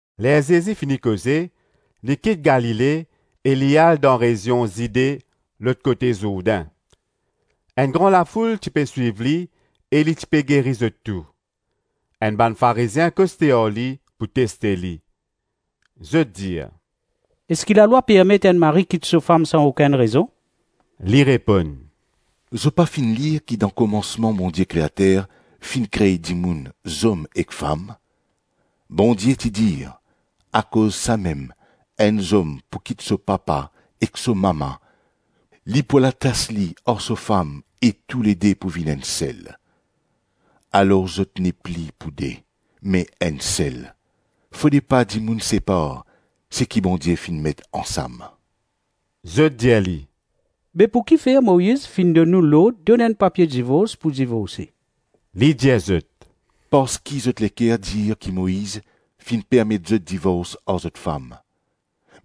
Ler Zezi fini koze, li kit Galile e li al dan rezion Zide lot kote Zourdin. Enn gran lafoul ti pe swiv li e li ti pe geri zot tou. Enn bann Farizien koste ar li pou teste li. Zot dir, “Eski lalwa permet enn mari kit so fam san okenn rezon?” Li reponn, “Zot pa finn lir ki dan komansman Bondie Kreater finn kre dimoun zom ek fam? Bondie ti dir, ‘Akoz samem enn zom pou kit so papa ek so mama, li pou al atas li ar so fam e toulede pou vinn enn sel.’ Alor zot nepli pou de, me enn sel. Fode pa dimoun separ seki Bondie finn met ansam.” Zot dir li, “Be pou kifer Moiz finn donn nou lord donn enn papie divors pou divorse?” Li dir zot, “Parski zot leker dir ki Moiz finn permet zot divors ar zot fam;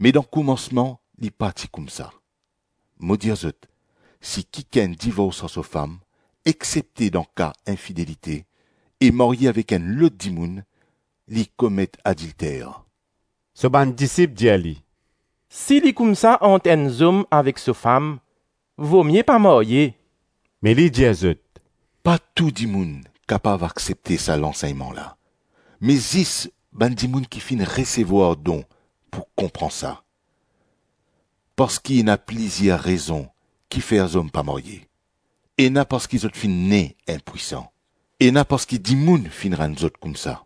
me dan komansman li pa ti koumsa. Mo dir zot, si kikenn divors ar so fam, exsepte dan ka infidelite, e marye avek enn lot dimoun, li komet adilter.” So bann disip dir li, “Si li koumsa ant enn zom avek so fam, vomie pa marye.” Me li dir zot, “Pa tou dimoun kapav aksepte sa lansegnman la, me zis bann dimoun ki finn resevwar don pou konpran sa. Parski ena plizir rezon kifer zom pa marye, ena parski zot finn ne inpwisan, ena parski dimoun finn rann zot koumsa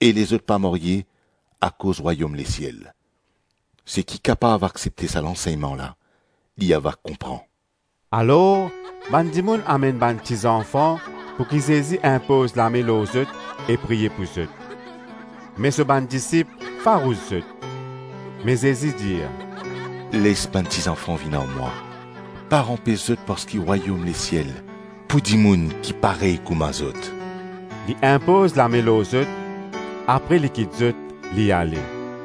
e lezot pa marye akoz Rwayom Lesiel. Seki kapav aksepte sa lansegnman la, li ava konpran.” Alor bann dimoun amenn bann tizanfan pouki Zezi inpoz lame lor zot e priye pou zot; me so bann disip farous zot. Me Zezi dir, “Les bann ti zanfan vinn ar mwa, pa anpes zot parski Rwayom Lesiel pou dimoun ki parey kouma zot.” Li inpoz lame lor zot, apre li kit zot, li ale.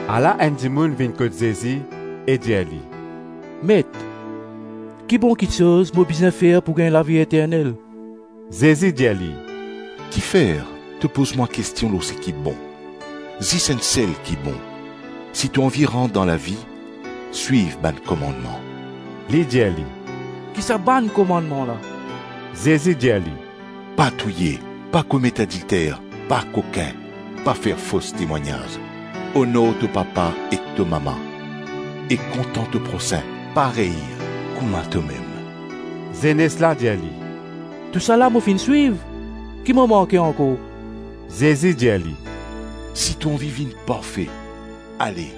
Ala enn dimoun vinn kot Zezi e dir li, “Met, ki bon kiksoz mo bizin fer pou gagn lavi eternel?” Zezi dir li, “Kifer to poz mwa kestion lor seki bon? Zis Enn Sel ki bon. Si to anvi rant dan lavi, swiv bann komannman.” Li dir li, “Ki sa bann komannman la?” Zezi dir li, “Pa touye, pa komet adilter, pa kokin, pa fer fos temwagnaz, onor to papa ek to mama, e kontan to prosin parey kouma tomem.” Zenes la dir li, “Tousala mo finn swiv, ki mo manke ankor?” Zezi dir li, “Si to anvi vinn parfe, ale,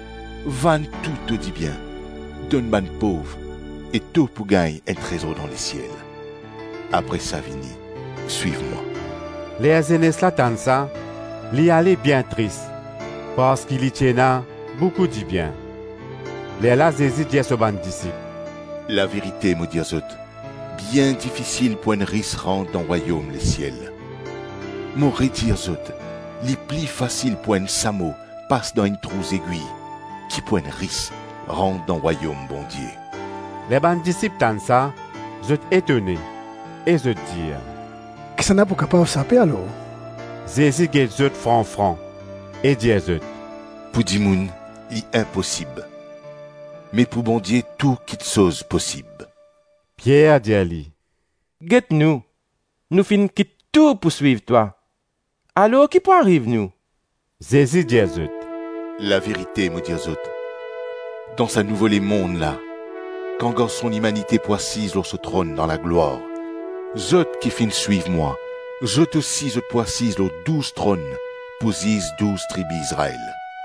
vann tou to dibien, donn bann pov e to pou gagn enn trezor dan lesiel; apre sa vini, swiv mwa.” Ler zenes la tann sa, li ale bien tris parski li ti ena boukou dibien. Lerla Zezi dir so bann disip, “Laverite, mo dir zot, bien difisil pou enn ris rant dan Rwayom lesiel. Mo redir zot, li pli fasil pou enn samo pas dan enn trou zegwi ki pou enn ris rant dan Rwayom Bondie.” Ler bann disip tann sa, zot etone e zot dir, “Kisannla pou kapav sape alor?” Zezi get zot fran-fran e dir zot, “Pou dimoun, li inposib, me pou Bondie tou kiksoz posib.” Pier dir li, “Get nou, nou finn kit tou pou swiv twa. Alor ki pou ariv nou?” Zezi dir zot, “Laverite mo dir zot, dan sa nouvo lemonn la, kan Garson Limanite pou asiz lor so tronn dan laglwar, zot ki finn swiv mwa, zot osi zot pou asiz lor douz tronn pou ziz douz tribi Izrael.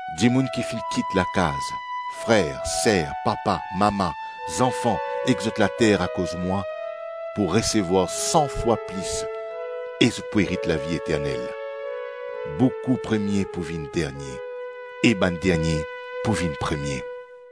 Dimoun ki finn kit lakaz, frer, ser, papa, mama, zanfan ek zot later akoz mwa, pou resevwar san fwa plis e zot pou erit lavi eternel. Boukou premie pou vinn dernie, e bann dernie pou vinn premie.”